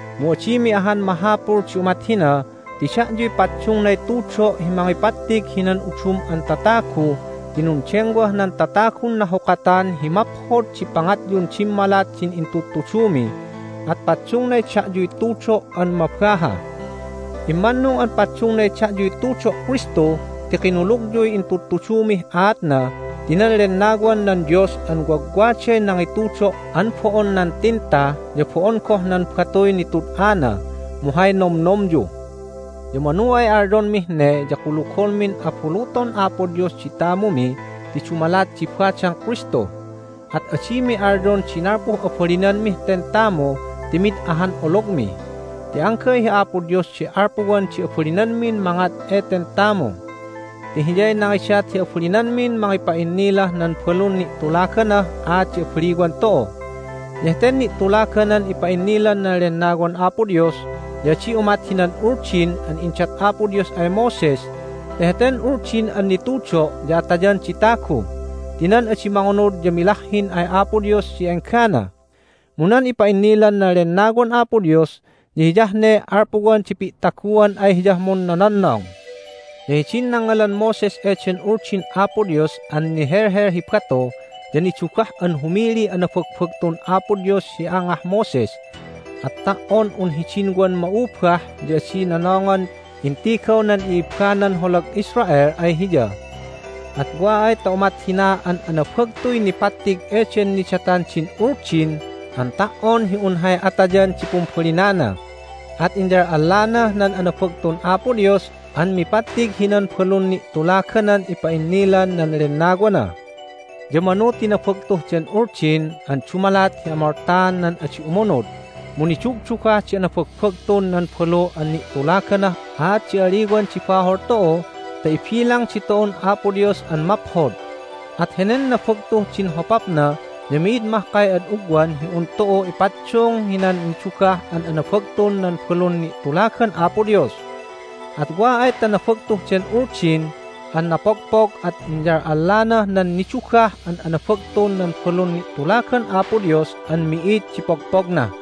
Mu adimi ahan mahapul di umat hina ti da'yuy paddungnay tudo' hi mangipattig hinan udum an tatagu ti nundengwah nan tatagun nahukatan hi maphod di pangatyun dimmalat din intudtudumi, at paddungnay da'yuy tudo' an mabaha. Immannung an paddungnay da'yuy tudo' Kristu ti kinulugyuy intudtudumih aatna ti nan Lennawan nan Dios an wagwaday nangitudo' an bo'on nan tinta, ya bo'on goh nan batuy nitud'ana, mu hay nomnomyu. Ya manu ay alyonmih ne ya kulugonmin abuluton Apo Dios di tamumi ti dumalat di badang Kristu. At adimi alyon di nalpuh abalinanmih ten tamu ti mid ahan ologmi. Ti anggay hi Apo Dios di alpuwan di abalinanmin mangat eten tamu. Ti Hiyay nangidat hi abalinanmin mangipa'innilah nan balun ni'tulaganah aat di abaliwan tu'u. Ya heten ni'tulaganan ipa'innilan nan Lennawan Apo Dios ya adi umat hinan Uldin an indat Apo Dios ay Moses ti heten Uldin an nitudo' ya atayan di tagu ti nan adi mangunud ya milahhin ay Apo Dios hi enggana. Mu nan ipa'innilan nan Lennawan Apo Dios ya hiyah ne alpuwan di pi'taguan ay Hiyah munnononnong. Ya hidin nangngalan Moses eden Uldin Apo Dios an nihelhel hi batu ya nidugah an humiliy anabagbagtun Apo Dios hi angah Moses, at ta"on un hidin wan ma'ubah ya adi nonongan intigaw nan i'ibbanan holag Israel ay hiya. At wa ay ta umat hina an anabagtuy nipattig eden nidatan din Uldin an ta"on hi un hay atayan di pumbalinana at inyal'allanah nan anabagtun Apo Dios an mipattig hinan balun ni'tulaganan ipa'innilan nan Lennawana! Ya manu ti nabagtuh den Uldin an dumalat hi amoltaan nan adi umunud, mu nidugdugah di anabagbagtun nan balu an ni'tulaganah aat di a'aliwan di bahol tu'u ta ibilang ditu'un Apo Dios an maphod. At henen nabagtuh din hopapna ya mi'id mahkay ad ugwan hi un tu'u ipaddung hinan nidugah an anabagtun nan balun ni'tulagan Apo Dios. At wa ay ta nabagtuh den Uldin an napogpog at inyal'allanah nan nidugah an anabagtun nan balun ni'tulagan Apo Dios an mi'id di pogpogna!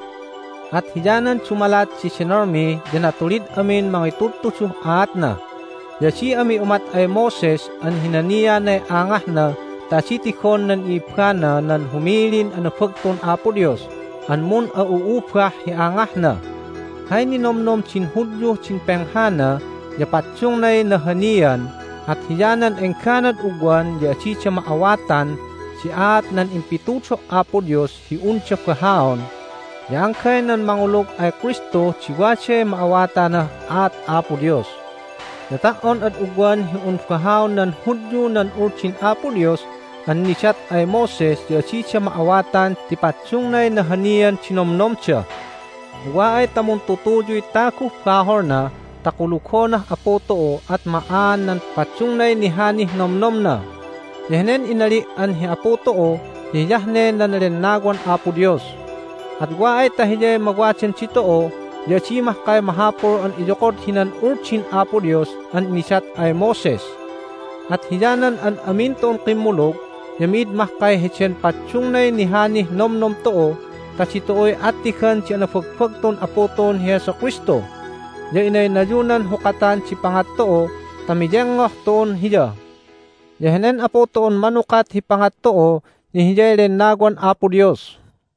At hiyanan dumalat di denolmi ya natulid amin mangitudtuduh aatna. Ya adi ami umat ay Moses an hinanianay angahna ta adi tigon nan i'ibbana nan humilin anabagtun Apo Dios an mun'a'u'ubah hi angahna. Hay ninomnom din Hudyuh din penghana ya paddungnay nahanian, at hiyanan engganad ugwan ya adida ma'awatan di aat nan impitudo' Apo Dios hi unda bahaon, ya anggay nan mangulug ay Kristu di waday ma'awatanah aat Apo Dios. Ya ta"on ad ugwan hi un bahaon nan Hudyu nan Uldin Apo Dios an nidat ay Moses ya adida ma'awatan ti paddungnay nahanian di nomnomda. Mu wa ay ta muntutuyuy taguh baholna ta kulugonah Apu tu'u at ma'aan nan paddungnay nihanih nomnomna. Ya henen inali' an hi Apu tu'u ya hiyah ne nan Lennawan Apo Dios. At wa ay ta Hiyay mawadan ditu'u ya adi mahkay mahapul an iyokod hinan Uldin Apo Dios an nidat ay Moses. At hiyanan an amin tu'un kimmulug ya mi'id mahkay heden paddungnay nihanih nomnom tu'u ta ditu'uy attigan di anabagbagtun Apu tu'un hi Jesu Kristu, ya inaynayunan hukatan di pangat tu'u ta miyengngoh tu'un Hiya. Ya henen Apu tu'un manukat hi pangat tu'u ya Hiyay Lennawan Apo Dios.